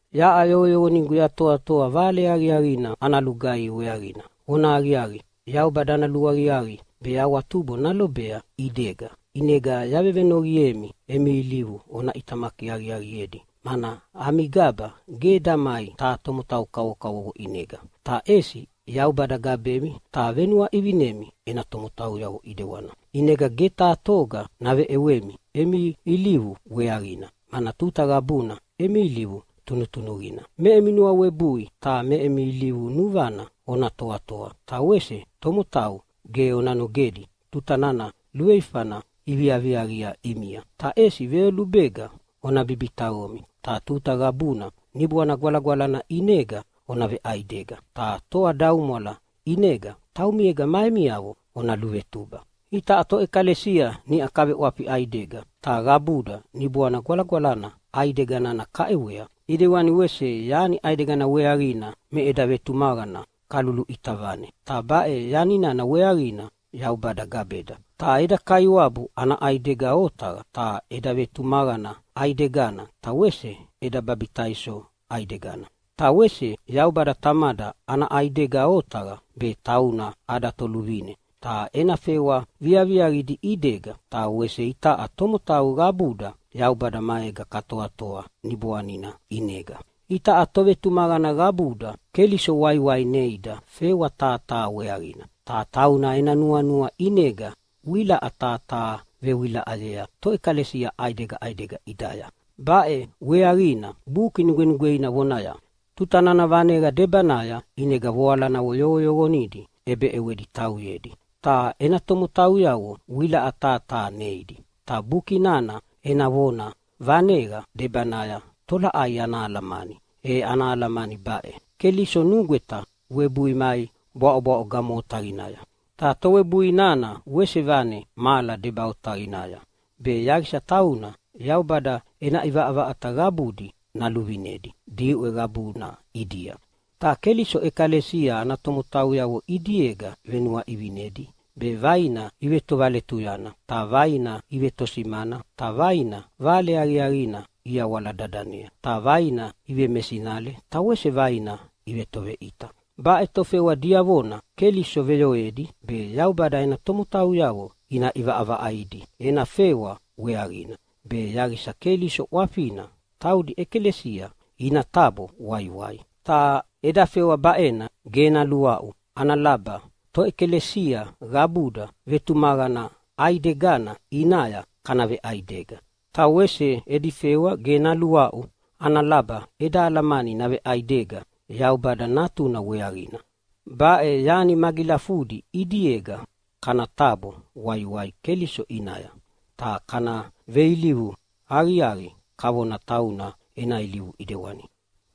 Yaʼa yoqoyoqonigu yatoatoa Vale Aqiaqina ana lugaihi weaqina. Vona aqiaqi, Yaubada ana luaqiaqi be awatubo nalobea ʼidega, ʼinegana yavevenoqiemi emi ilivu ona ʼitamaki aqiaqiedi, mana ami gaba ge damai taha tomotau kavokavovo ʼinega, ta ʼesi Yaubada gabemi ta venuaʼivinemi ena tomotauyavo ʼidewani. ʼInega ge taha toga naveʼewemi emi ilivu weaqina, mana tuta qabuna emi ilivu tunutunuqina. Me emi nuawebui ta me emi ilivu nuvana ona toatoa. Ta wese tomotau ge ona nogedi tuta nana luveifana iviaviaqia ʼimia, ta ʼesi veyolubega ona bibitaqomi. Ta tuta qabuna Niboana Gwalagwalana ʼinega ona veʼaidega, ta toadaumwala ʼinega taumiega ma emiavo ona luvetuba. Itaʼa toʼekalesia niʼau kaveʼwafi ʼaidega, ta qabuda Niboana Gwalagwalana ʼaidega nana kaʼewea. ʼIdewani wese yani ʼaidegana weaqina me eda vetumaqana kaluluʼita vane, ta baʼe yani nana weaqina Yaubada gabeda. Ta eda Kaiwabu ana ʼaidega otaqa, ta eda vetumaqana ʼaigedana ta wese eda babitaiso ʼaidegana. Ta wese Yaubada Tamada ana ʼaidega otaqa, be tauna ada Toluvine, ta ena fewa viaviaqidi ʼidega, ta wese itaʼa tomotau qabuda Yaubada maega katoatoa Niboanina ʼinega. Itaʼa tovetumaqana qabuda Keliso waiwai neida fewa taha taha weaqina, ta tauna ena nuanua ʼinega wilaʼa taha taha vewilaʼayea toʼekalesia ʼaidega ʼaidega ʼidaya. Baʼe weaqina Buki Nugwenugweina vonaya, “Tuta nana vaneqa debanaya ʼinega voalanavo yoqoyoqonidi ʼebeʼewedi tauyedi, ta ena tomotauyavo wilaʼa taha taha neidi.” Ta Buki nana ena vona “vaneqa debanaya” tolaʼai ana alamani? E ana alamani baʼe: Keliso nugweta webui mai bwaʼobwaʼo gamo otaqinaya. Ta towebui nana wese vane mahala deba otaqinaya, be yaqisa tauna Yaubada ena ʼivaʼavaʼata qabudi naluvinedi diʼwe qabuna ʼidia. Ta Keliso ʼekalesia ana tomotauyavo ʼidiega venuaʼivinidi be vaina ivetovaletuyana, ta vaina ivetosimana, ta vaina Vale Aqiaqina iyawala dadanea, ta vaina ivemesinale ta wese vaina ivetoveʼita. Baʼe tofewa diavona Keliso veyoedi be Yaubada ena tomotauyavo ina ʼivaʼavaʼaidi ena fewa weaqina, be yaqisa Keliso ʼwafina taudi ʼekalesia ina tabo waiwai. Ta edi fewa baʼena ge naluaʼu ana laba toʼekalesia qabuda vetumaqana ʼaidegana ʼinaya kana veʼaidega, ta wese edi fewa ge naluaʼu ana laba eda alamani naveʼaidega Yaubada Natuna weaqina. Baʼe yani magilafudi ʼidiega kana tabo waiwai Keliso ʼinaya, ta kana veilivu aqiaqi kavona tauna ena ilivu ʼidewani.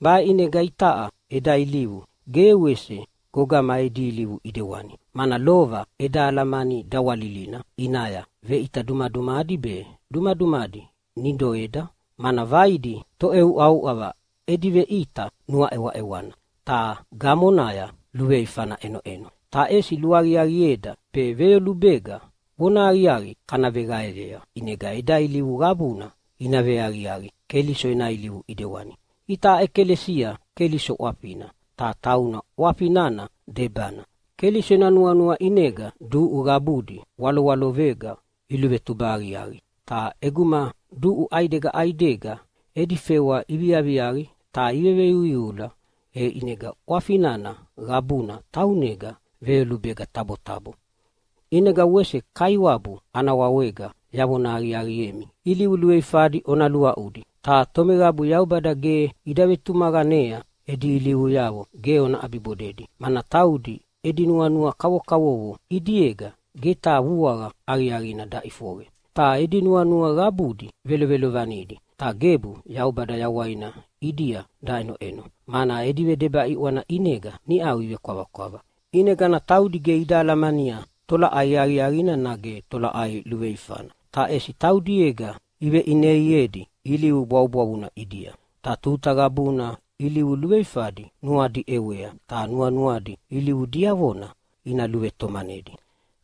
Baʼe ʼinega itaʼa eda ilivu ge wese gogama edi ilivu ʼidewani. Mana lova eda alamani dawalilina ʼinaya veʼita dumadumadi be dumadumadi nidoeda, mana vaidi toʼeuʼauʼava edi veʼita nuaʼewaʼewana, ta gamonaya luveifana ʼenoʼeno. Ta ʼesi luaqiaqieda be veyolubega vonahaqiaqi kana veqaeyea, ʼinega eda ilivu qabuna ina veaqiaqi Keliso ena ilivu ʼidewani. Itaʼa ʼekalesia Keliso ʼwafina, ta tauna ʼwafi nana debana. Keliso ena nuanua ʼinega duʼu qabudi walowaloqega iluvetuba aqiaqi. Ta ʼeguma duʼu ʼaidega ʼaidega edi fewa iviaviaqi ta iveveiuiula, e ʼinega ʼwafi nana qabuna taunega veyolubega tabotabo. ʼInega wese Kaiwabu ana wawega yavona aqiaqiemi, ilivu luveifadi ona luaʼudi, ta tomeqabu Yaubada ge ida vetumaqanea edi ilivuyavo ge ona ʼabibodedi, mana taudi edi nuanua kavokavovo ʼidiega ge taha vuaqa aqiaqina daʼifoqe. Ta edi nuanua qabudi velovelovanidi, ta gebu Yaubada yawaina ʼidia daʼenoʼeno, mana edi vedeba ʼiʼwana ʼinega niʼau ivekwavakwava. ʼInegana taudi ge ida alamania tolaʼai aqiaqina nage tolaʼai luveifana, ta ʼesi taudiega iveʼineiedi ilivu bwavubwavuna ʼidia. Ta tuta qabuna ilivu luveifadi nuadi ʼewea, ta nuanuadi ilivu diavona ina luvetomanidi.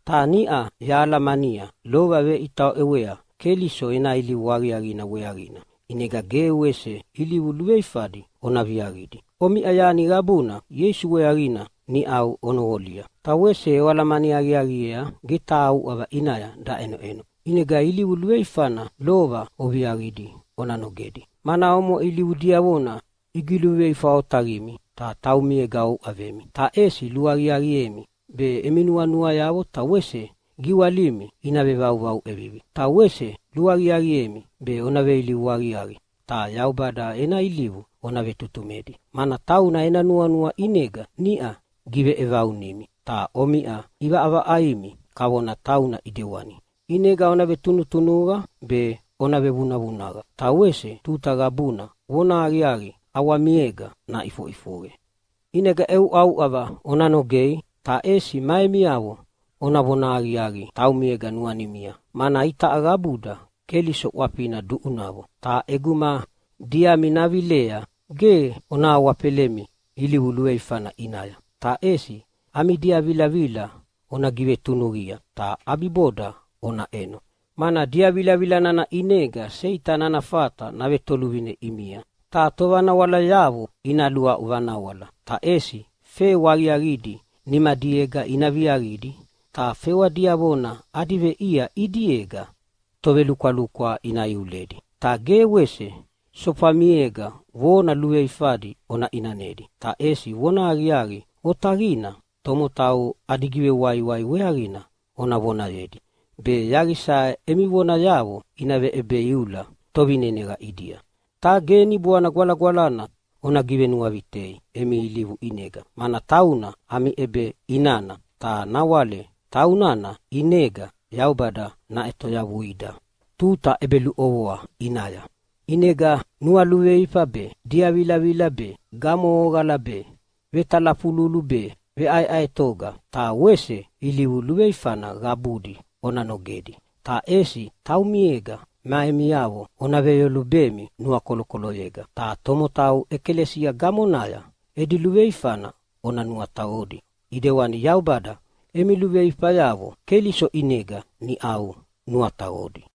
Ta niʼa yahalamania lova veʼita oʼewea Keliso ena ilivu aqiaqina weaqina, ʼinega ge wese ilivu luveifadi ona viaqidi. Omiʼa yani qabuna Ieisu weaqina niʼau onoqolia, ta wese oalamani aqiaqiea ge taha uʼava ʼinaya daʼenoʼeno. ʼInega ilivu luveifana lova oviaqidi ona nogedi, mana omoʼe ilivu diavona igiveluveifa otaqimi ta taumiega ouʼavemi. Ta ʼesi luaqiaqiemi be emi nuanuayavo ta wese giwalimi ina vevauvau ʼevivi. Ta wese luaqiaqiemi be ona veilivu aqiaqi ta Yaubada ena ilivu ona vetutumedi, mana tauna ena nuanua ʼinega niʼa giveʼevaunimi, ta omiʼa ʼivaʼavaʼaimi kavona tauna ʼidewani. ʼInega ona vetunutunuqa be ona vevunavunaqa ta wese tuta qabuna vonahaqiaqi ʼawamiega naʼifoʼifoqe. ʼInega ʼeuʼauʼava ona nogei ta ʼesi ma emiavo ona vonahaqiaqi taumiega nuanimia, mana itaʼa qabuda Keliso ʼwafina duʼunavo. Ta ʼeguma diami navilea ge ona awafelemi ilivu luveifana ʼinaya, ta ʼesi ami diavilavila ona givetunuqia, ta ʼabiboda ona ʼeno, mana diavilavila nana ʼinega Seitani ana fata navetoluvine ʼimia. Ta tovanawalayavo ina luaʼu vanawala! Ta ʼesi fewa aqiaqidi nimadiega ina viaqidi, ta fewa diavona adi veʼia ʼidiega tovelukwalukwa ina iuledi. Ta ge wese sofamiega vona luveifadi ona ʼinanedi, ta ʼesi vonahaqiaqi otaqina tomotau adi givewaiwai weaqina ona vonayedi, be yaqisa emi vonayavo ina veʼebeiula tovineneqa ʼidia. Ta ge Niboana Gwalagwalana ona givenuavitei emi ilivu ʼinega, mana tauna ami ʼebeʼinana. Ta nawale taunana ʼinega Yaubada naʼetoyavuida tuta ʼebeluʼovoa ʼinaya. ʼInega nualuveifa be, diavilavila be, gamohoqala be, vetalafululu be, veʼaeʼaetoga, ta wese ilivu luveifana qabudi ona nogedi. Ta ʼesi taumiega ma emiavo ona veyolubemi nuakolokoloyega, ta tomotau ʼekalesia gamonaya edi luveifana ona nuataqodi, ʼedewana Yaubada emi luveifayavo Keliso ʼinega niʼau nuataqodi.